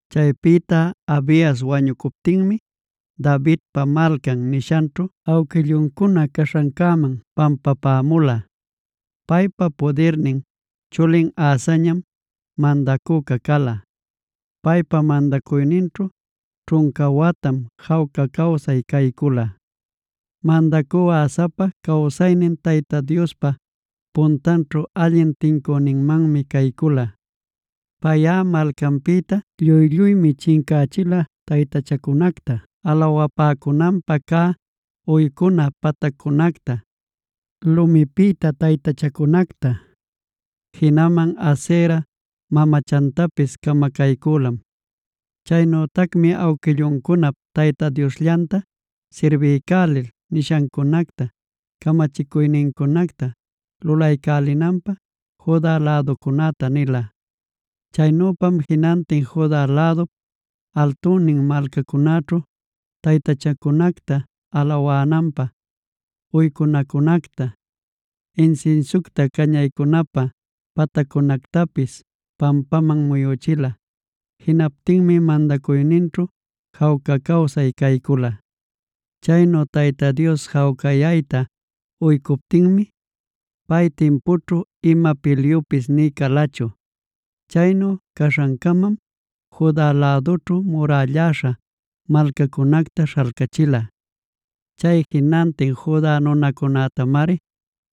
Chaypïta Abias wañucuptinmi Davidpa Malcan nishanćhu awquilluncuna caśhancäman pampapämula. Paypa pudirnin chulin Asamñam mandacüca cala. Paypa mandacuyninćhu ćhunca watam jawca cawsay caycula. Mandacü Asapa cawsaynin Tayta Diospa puntanćhu allin tincüninmanmi caycula. Payꞌa malcanpïta lluy-lluymi chincächila taytachacunacta alawapäcunanpä cä uycuna pataccunacta, lumipïta taytachacunacta; jinaman Asera mamachantapis camacaycülam. Chaynütacmi awquilluncunap Tayta Diosllanta ashiycälil nishancunacta, camachicuynincunacta lulaycälinanpä Juda läducunäta nila. Chaynüpam jinantin Juda lädup altunnin malcacunäćhu taytachacunacta alawananpä uycunacunacta, insinsiucta cañaycunapä pataccunactapis pampaman muyüchila. Jinaptinmi mandacuyninćhu jawca cawsay caycula. Chaynu Tayta Dios jawcayayta uycuptinmi, pay timpućhu ima pilyupis nï calachu. Chaynu caśhancamam Juda lädućhu murälläśha malcacunacta śhalcachila. Chay jinantin Juda nunacunätamari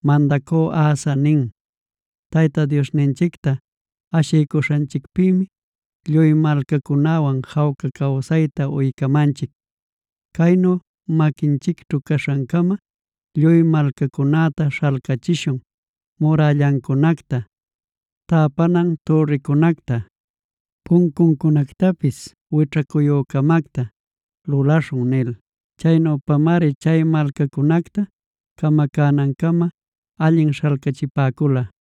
mandacü Asa nin: “Tayta Diosninchicta ashiycuśhanchicpïmi lluy malcacunäwan jawca cawsayta uycamanchic. Caynu maquinchicćhu caśhancama lluy malcacunäta śhalcachishun murällancunacta, täpanan türricunacta, puncuncunactapis wićhacuyü-camacta lulaśhun” nil. Chaynüpamari chay malcacunacta camacänancama allin śhalcachipäcula.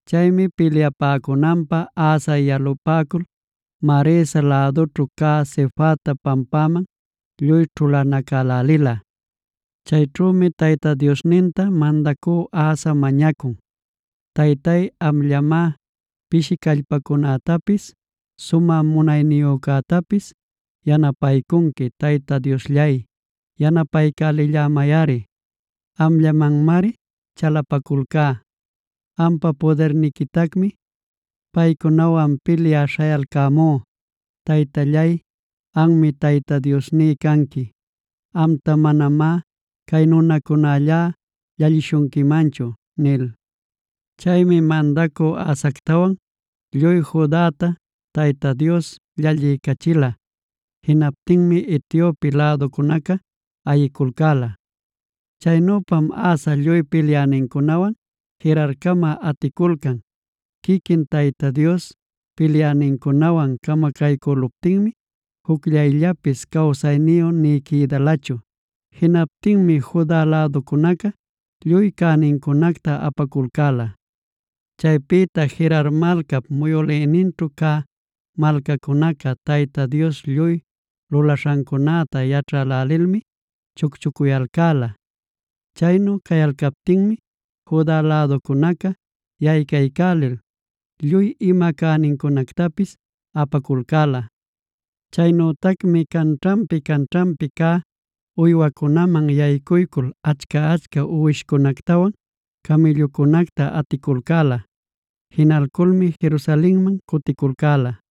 Chaymi pilyapäcunanpä Asa yalapäcul, Maresap lädunćhu cä Sefata pampaman lluy ćhulanacälälila. Chayćhümi Tayta Diosninta mandacü Asa mañacun: “Taytay, amllamá pishi callpayücätapis sumä munayniyücätapis yanapaycunqui. Tayta Diosllay yanapaycälillämayꞌari. Amllamanmari chalapaculcá. Ampa pudirniquitacmi paycunawan pilyä śhayalcämú. Taytallay, anmi Tayta Diosní canqui. Amta manamá cay nunacunälla llallishunquimanchu” nil. Chaymi mandacü Asactawan lluy Judata Tayta Dios llalliycachila. Jinaptinmi Etiope läducunaca ayiculcäla. Chaynüpam Asa lluy pilyänincunawan Gerarcama aticulcan. Quiquin Tayta Dios pilyänincunawan camacaycüluptinmi jucllayllapis cawsayniyu nï quïdalachu. Jinaptinmi Juda läducunaca lluy cänincunacta apaculcäla. Chaypïta Gerar malcap muyülïninćhu cä malcacunaca Tayta Dios lluy lulaśhancunacta yaćhälälilmi chucchucuyalcäla. Chaynu cayalcaptinmi Juda läducunaca yaycaycälil lluy ima cänincunactapis apaculcäla. Chaynütacmi canćhanpi-canćhanpi cä uywacunäman yaycuycul achca-achca uwishcunactawan camïllucunacta aticulcäla. Jinalculmi Jerusalenman cuticulcäla.